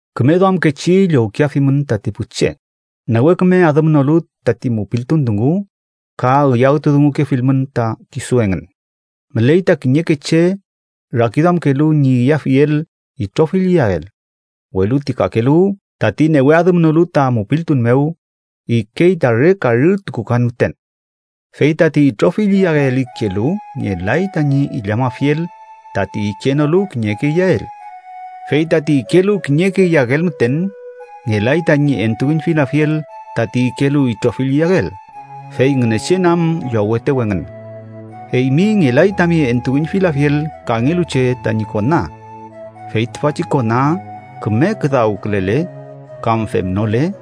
Küme duamkechi llowkeafimün tati pu che, newe küme adümnolu tati mupiltun dungu, ka üyawtudungukefilmün ta kisu engün. Müley ta kiñeke che rakiduamkelu ñi iyafiel itrofill iyael, welu ti kakelu, tati newe adümnolu ta mupiltun mew, ikey ta re karü tukukan müten. Fey tati itrofill iyael ikelu ngelay tañi illamafiel tati ikenolu kiñeke iyael. Fey tati ikelu kiñeke iyael müten, ngelay tañi entuüñfilafiel tati ikelu itrofill iyael, fey Ngünechen am llowetew engün. Eymi ngelay tami entuüñfilafiel kangelu che tañi kona. Fey tüfachi kona küme küdawkülele kam femnole,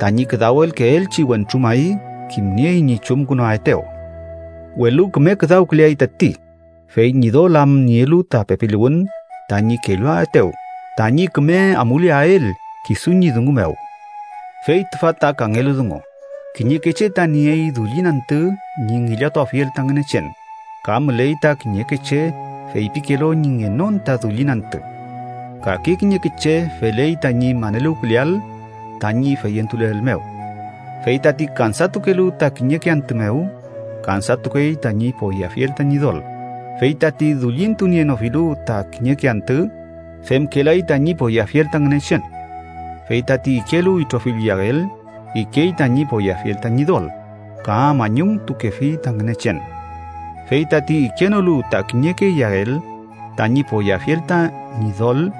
tañi küdawelkeelchi wentru may kimniey ñi chumkünuaetew. Welu küme küdawküleay tati, fey Ñidol am nielu ta pepiluwün tañi kelluaetew tañi küme amuleael kisu ñi dungu mew. Fey tüfa ta kangelu dungu: kiñeke che ta niey dullin antü ñi ngillatuafiel ta Ngünechen, ka müley ta kiñeke che feypikelu ñi ngenon ta dullin antü. Kake kiñeke che feley tañi maneluwküleael tañi feyentuleel mew. Fey tati kansatukelu ta kiñeke antü mew, kansatukey tañi poyeafiel ta Ñidol, fey tati dullintunienofilu ta kiñeke antü, femkelay tañi poyeafiel ta Ngünechen. Fey tati ikelu itrofill iyael, ikey tañi poyeafiel ta Ñidol, ka mañumtukefi ta Ngünechen. Fey tati ikenolu ta kiñeke iyael, tañi poyeafiel ta Ñidol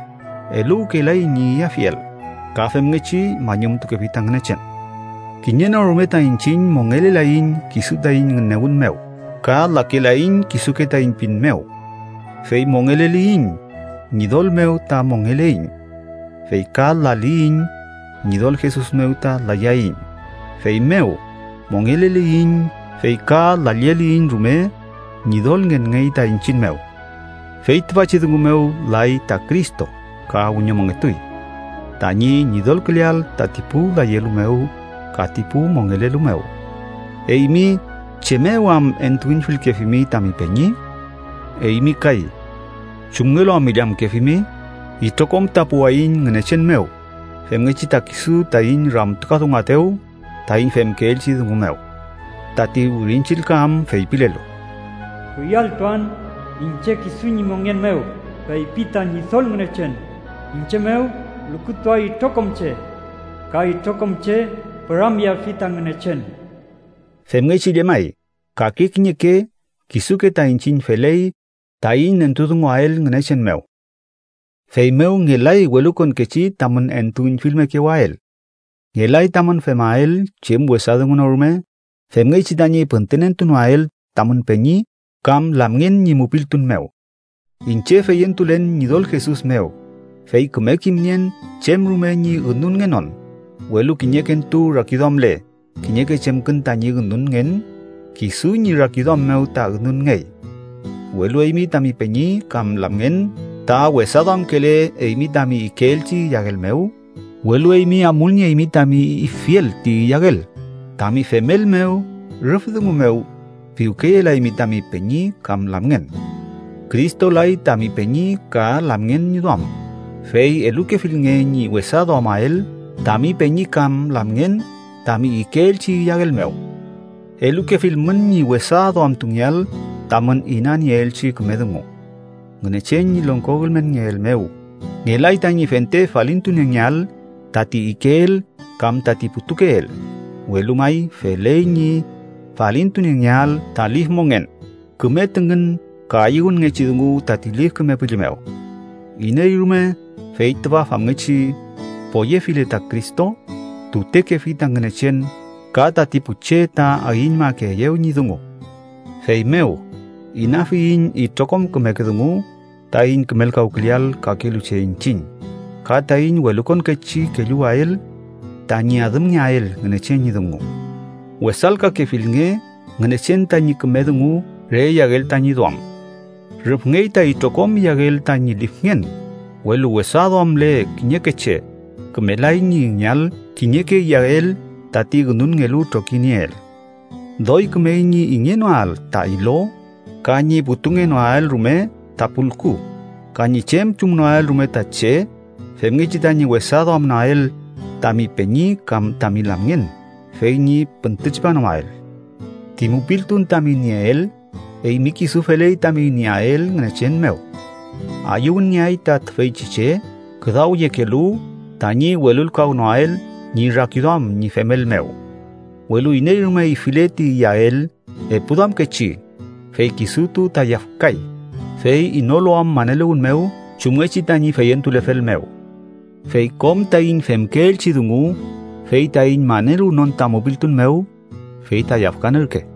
eluwkelay ñi iyafiel, ka femngechi mañumtukefi ta Ngünechen. Kiñe no rume ta iñchiñ mongelelaiñ kisu taiñ ngünewün mew ka lakelaiñ kisuke taiñ pin mew. Fey mongeleliyiñ, Ñidol mew ta mongeleiñ. Fey ka laliyiñ, Ñidol Jesus mew ta layaiñ. Feymew mongeleliyiñ fey ka lalleliyiñ rume, Ñidol ngenngey ta iñchiñ mew. Fey tüfachi dungu mew lay ta Cristo ka wiñomongetuy: tañi Ñidolküleael tati pu layelu mew ka ti pu mongelelu mew. ¿Eymi chem mew am entuüñfilkefimi tami peñi? Eymi kay, ¿chumngelu am illamkefimi? Itrokom ta puwaiñ Ngünechen mew, femngechi ta kisu taiñ ramtukadunguaetew taiñ femkeelchi dungu mew. Tati Wirin Chillka am feypilelu: “Kuyalltuan iñche kisu ñi mongen mew, feypi ta Ñidol Ngünechen, iñche mew lukutuay itrokom che ka itrokom che püramyeafi ta Ngünechen.” Femngechi llemay, kake kiñeke kisuke ta iñchiñ feley taiñ nentudunguael Ngünechen mew. Feymew ngelay welukonkechi tamün entuüñfilmekewael. Ngelay tamün femael chem wesa dungu no rume femngechi tañi püntünentunoael tamün peñi kam lamngen ñi mupiltun mew. Iñche feyentulen Ñidol Jesus mew, fey küme kimnien chem rume ñi ünunngenon, welu kiñekentu rakiduamle kiñeke chemkün tañi ünunngen, kisu ñi rakiduam mew ta ünunngey. Welu eymi tami peñi kam lamngen ta wesa duamkele eymi tami ikeelchi iyael mew, welu eymi amulnieymi tami ifiel ti iyael, tami femel mew rüf dungu mew piwkeyelaymi tami peñi kam lamngen. ¡Cristo lay tami peñi ka lamngen ñi duam, fey elukefilnge ñi wesa duamael tami peñi kam lamngen tami ikeelchi iyael mew! Elukefilmün ñi wesa duamtungeael tamün inanieelchi küme dungu. Ngünechen ñi longko ülmenngeel mew, ngelay tañi fente falintuniengeael tati ikeel kam tati putukeel, welu may feley ñi falintuniengeael ta lif mongen, küme tüngün ka ayüwünngechi dungu tati Lif Küme Püllü mew. Iney rume fey tüfa famngechi poyefile ta Cristo, tutekefi ta Ngünechen ka tati pu che ta ayüñmakeeyew ñi dungu. Feymew, inafiyiñ itrokom kümeke dungu taiñ kümelkawküleael kakelu che iñchiñ, ka taiñ welukonkechi kelluwael tañi adümngeael Ngünechen ñi dungu. Wesalkakefilnge Ngünechen tañi küme dungu re iyael tañi duam. Rüfngey ta itrokom iyael tañi lifngen, welu wesa duamle kiñeke che, kümelay ñi ingeael kiñeke iyael tati ünunngelu trokinieel. Doy kümey ñi ingenoael ta ilo, ka ñi putungenoael rume ta pulku, ka ñi chem chumnoael rume ta che femngechi tañi wesa duamnoael tami peñi kam tami lamngen, fey ñi püntütripanoael. Ti mupiltun tami nieel, eymi kisu feley tami nieael Ngünechen mew. ¡Ayüwünngeay ta tüfeychi che küdawyekelu tañi welulkawnoael ñi rakiduam ñi femel mew! Welu iney rume ifile ti iyael epuduamkechi, fey kisutu ta yafkay, fey inolu am maneluwün mew chumngechi tañi feyentulefel mew. Fey kom taiñ femkeelchi dungu fey taiñ maneluwnon ta mupiltun mew, fey ta yafkan ürke.